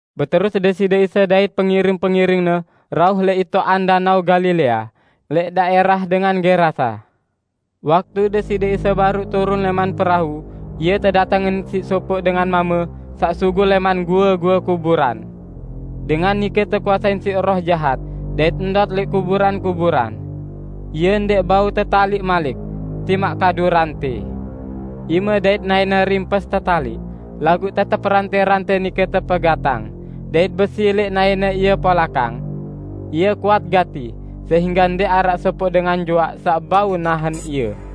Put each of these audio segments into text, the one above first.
Beterus Deside Isa dait pengiring-pengiring-Ne rauh lẽq itoqan Danao Galilea, lẽq daẽrah dengan Gerasa. Waktu Deside Isa baruq turun lẽman perau, Ie tedatengin siq sopoq dengan mame saq sugul lẽman goe-goe kuburan. Dengan nike tekuasein siq roh jahat dait ndot lẽq kuburan-kuburan. Ie ndẽq bau tetaliq malik; timaq kadu rantẽ. Ime dait naẽne rimpes tetaliq, laguq tetep rantẽ-rantẽ nike tepegatang, dait besi lẽq naẽne ie polakang. Ie kuat gati sehingge ndẽq araq sopoq dengan juaq saq bau nahen ie.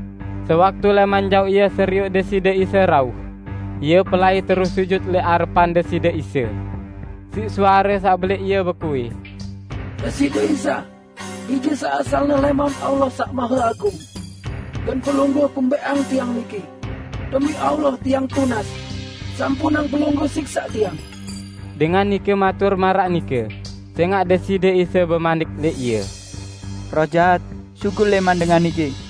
Sewaktu lẽman jaoq ie serioq Deside Isa rauh, ie pelai terus sujut lẽq arepan Deside Isa. Siq suare saq belẽq ie bekuih, "Deside Isa, Bije saq asalne lẽman Allah Saq Maheagung! Gen Pelungguh kumbẽqang tiang niki? Demi Allah tiang tunas, sampunang Pelungguh siksaq tiang!" ( Dengan nike matur maraq nike sẽngaq Deside Isa bemanik lẽq ie, "Roh jahat, sugul lẽman dengan niki!")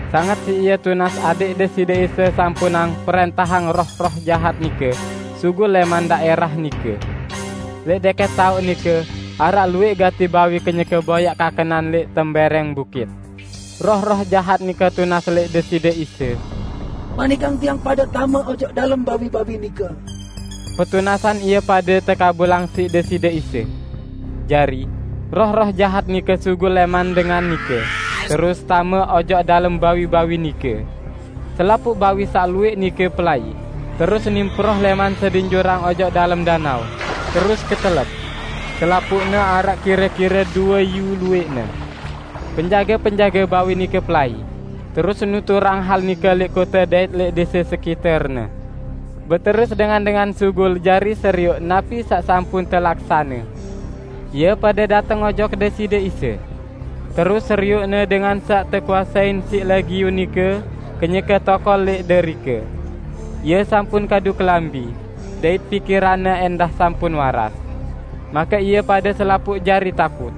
Sanget siq ie tunas adẽq Deside Isa sampunang prẽntahang roh-roh jahat nike sugul lẽman daẽrah nike. Lẽq dẽkẽt taoq nike araq luwẽq gati bawi kenyeke boyaq kakenan lẽq tembẽrẽng bukit. Roh-roh jahat nike tunas lẽq Deside Isa, "Manikang tiang pade tame ojok dalem bawi-bawi nike." Petunasan ie pade tekabulang siq Deside Isa. Jari, roh-roh jahat nike sugul lẽman dengan nike terus tame ojok dalem bawi-bawi nike. Selapuq bawi saq luwẽq nike pelai, terus nimproh lẽman sedin jurang ojok dalem danao, terus ketelep -- selapuqne araq kire-kire due iyu luwẽqne. Penjage-penjage bawi nike pelai, terus nuturang hal nike lẽq kote dait lẽq dẽse sekiterne. Beterus dengan-dengan sugul jari serioq napi saq sampun telaksane. Ie pade dateng ojok Deside Isa. Terus serioqne dengan saq tekuasein siq Legiun nike, kenyeke tokol lẽq derike. Ie sampun kadu kelambi, dait pikiranne ẽndah sampun waras. Make ie pade selapuq jari takut.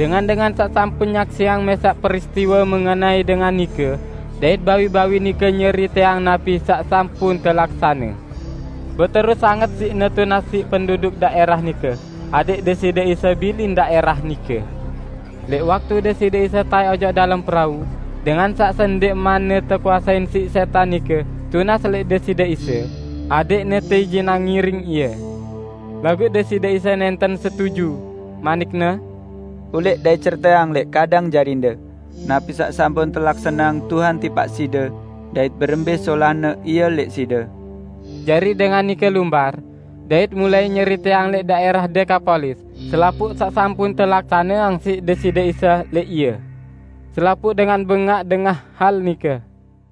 Dengan-dengan saq sampun nyaksiang mẽsaq peristiwe mengenai dengan nike dait bawi-bawi nike nyeriteang napi saq sampun telaksane. Beterus sanget siqne tunas siq penduduk daẽrah nike adẽq Deside Isa bilin daẽrah nike. Lẽq waktu Deside Isa taẽk ojok dalem perau, dengan saq sendẽqmanne tekuasein siq sẽtan nike tunas lẽq Deside Isa, adẽqne teijinang ngiring Ie. Laguq Deside Isa nẽnten setuju, manik-Ne, "Ulẽq dait ceriteang lẽq kadang jarinde napi saq sampun telaksaneang Tuhan tipaq side dait berembẽ solahne Ie lẽq side!" Jari dengan nike lumbar, dait mulai nyeriteang lẽq daẽrah Dekapolis selapuq saq sampun telaksaneang siq Deside Isa lẽq ie. Selapuq dengan bengaq dengah hal nike.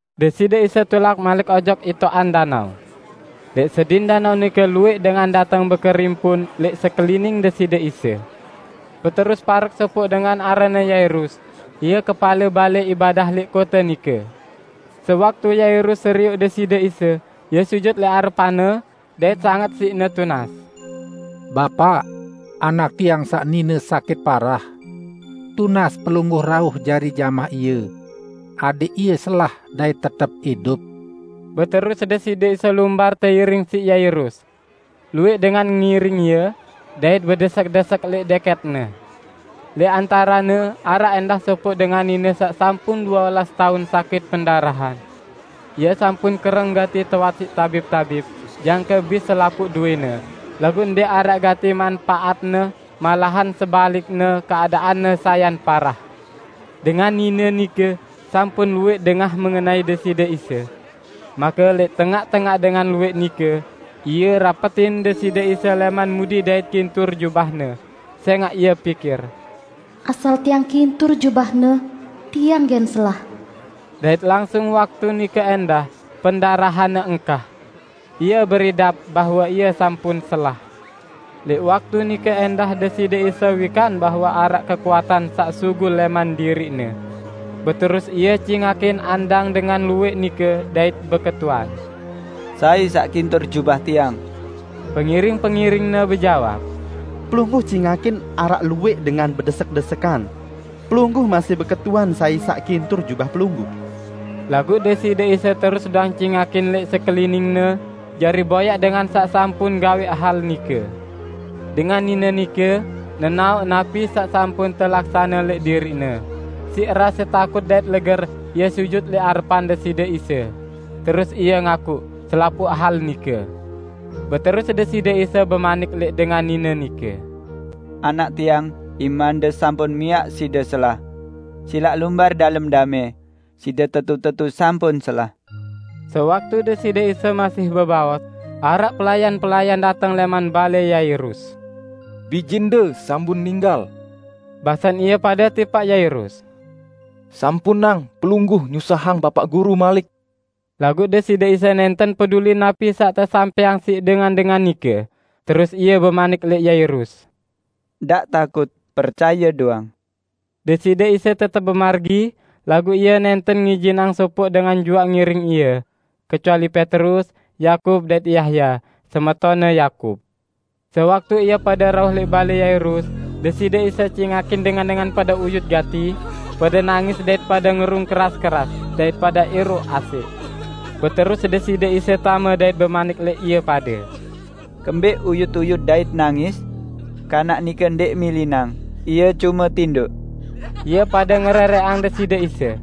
Deside Isa tulak malik ojok itoqan danao. Lẽq sedin danao nike luwẽq dengan dateng bekerimpun lẽq sekelining Deside Isa. Beterus parek sopoq dengan aranne Yairus, ie kepale balẽ ibadah lẽq kote nike. Sewaktu Yairus serioq Deside Isa, ie sujut lẽq arepan-Ne, dait sanget siqne tunas, "Bapaq, anak tiang saq nine sakit parah. Tunas Pelungguh rauh jari jamah ie adẽq ie selah dait tetep idup!" Beterus Deside Isa lumbar teiring siq Yairus. Luwẽq dengan ngiring Ie, dait bedesek-desekan lẽq dẽkẽt-Ne. Lẽq antarene araq ẽndah sopoq dengan nine saq sampun due olas taun sakit pendarahan. Ie sampun kereng gati teowat siq tabib-tabib, jangke bis selapuq dowẽne, laguq ndẽq araq gati manpaatne malahan sebalikne keadaanne sayan parah. Dengan nine nike sampun luwẽq dengah mengenai Deside Isa. Make lẽq tengaq-tengaq dengan luwẽq nike, ie rapetin Deside Isa lẽman mudi dait kintur jubah-Ne, sẽngaq ie pikir, "Asal tiang kintur jubah-Ne, tiang gen selah!" Dait langsung waktu nike ẽndah pendarahanne engkah. Ie beridap bahwe ie sampun selah. Lẽq waktu nike ẽndah Deside Isa wikan bahwe araq kekuatan saq sugul lẽman diriq-Ne. Beterus Ie cingakin andang dengan luwẽq nike dait beketuan, "Sai saq kintur jubah Tiang?" Pengiring-pengiring-Ne bejawab, "Pelungguh cingakin araq luwẽq dengan bedesek-desekan. Pelungguh masih beketuan sai saq kintur jubah Pelungguh?" Laguq Deside Isa terus doang cingakin lẽq sekelining-Ne jari boyaq dengan saq sampun gawẽq hal nike. Dengan nine nike nenaoq napi saq sampun telaksane lẽq diriqne, siq rase takut dait leger ie sujut lẽq arepan Deside Isa, terus ie ngakuq selapuq hal nike. Beterus Deside Isa bemanik lẽq dengan nine nike, "Anak Tiang, imande sampun miaq side selah! Silaq Lumbar dalem damẽ, side tetu-tetu sampun selah!" Sewaktu Deside Isa masih bebaos, araq pelayan-pelayan dateng lẽman balẽ Yairus. "Bijende sampun ninggal," basen ie pade tipaq Yairus. "Sampunang pelungguh nyusahang Bapaq Guru malik." Laguq Deside Isa nẽnten peduli napi saq tesampẽang siq dengan-dengan nike, terus Ie bemanik lẽq Yairus, "Ndaq takut, percaye doang!" Deside Isa tetep bemargi, laguq Ie nẽnten ngijinang sopoq dengan juaq ngiring Ie, kecuali Petrus, Yakub dait Yahya, semetonne Yakub. Sewaktu ie pade rauh lẽq balẽ Yairus, Deside Isa cingakin dengan-dengan pade uyut gati, pade nangis dait pade ngerung keras-keras dait pada er~oq asẽq. Beterus Deside Isa tame dait bemanik lẽq ie pade, "Kembẽq uyut-uyut dait nangis? Kanak nike ndẽq milinang, ie cume tindoq!" Ie pade ngerẽrẽqang Deside Isa.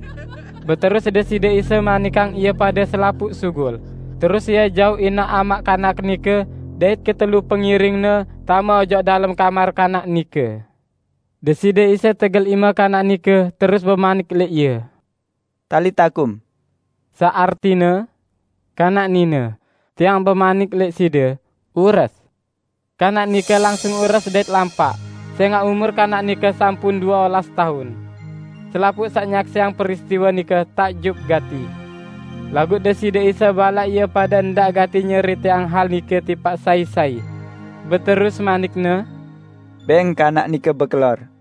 Beterus Deside Isa manikang ie pade selapuq sugul, terus Ie jauq inaq amaq kanak nike dait ketelu pengiring-Ne tame ojok dalem kamar kanak nike. Deside Isa tegel ime kanak nike terus bemanik lẽq ie, "Talita kum," saq artine, "Kanak nine, Tiang bemanik lẽq side: Ures!" Kanak nike langsung ures dait lampaq sẽngaq umur kanak nike sampun due olas taun. Selapuq saq nyaksiang peristiwe nike takjub gati! Laguq Deside Isa balaq ie pade ndaq gati nyeriteang hal nike tipaq sai-sai. Beterus manik-Ne, "Bẽng kanak nike bekelor."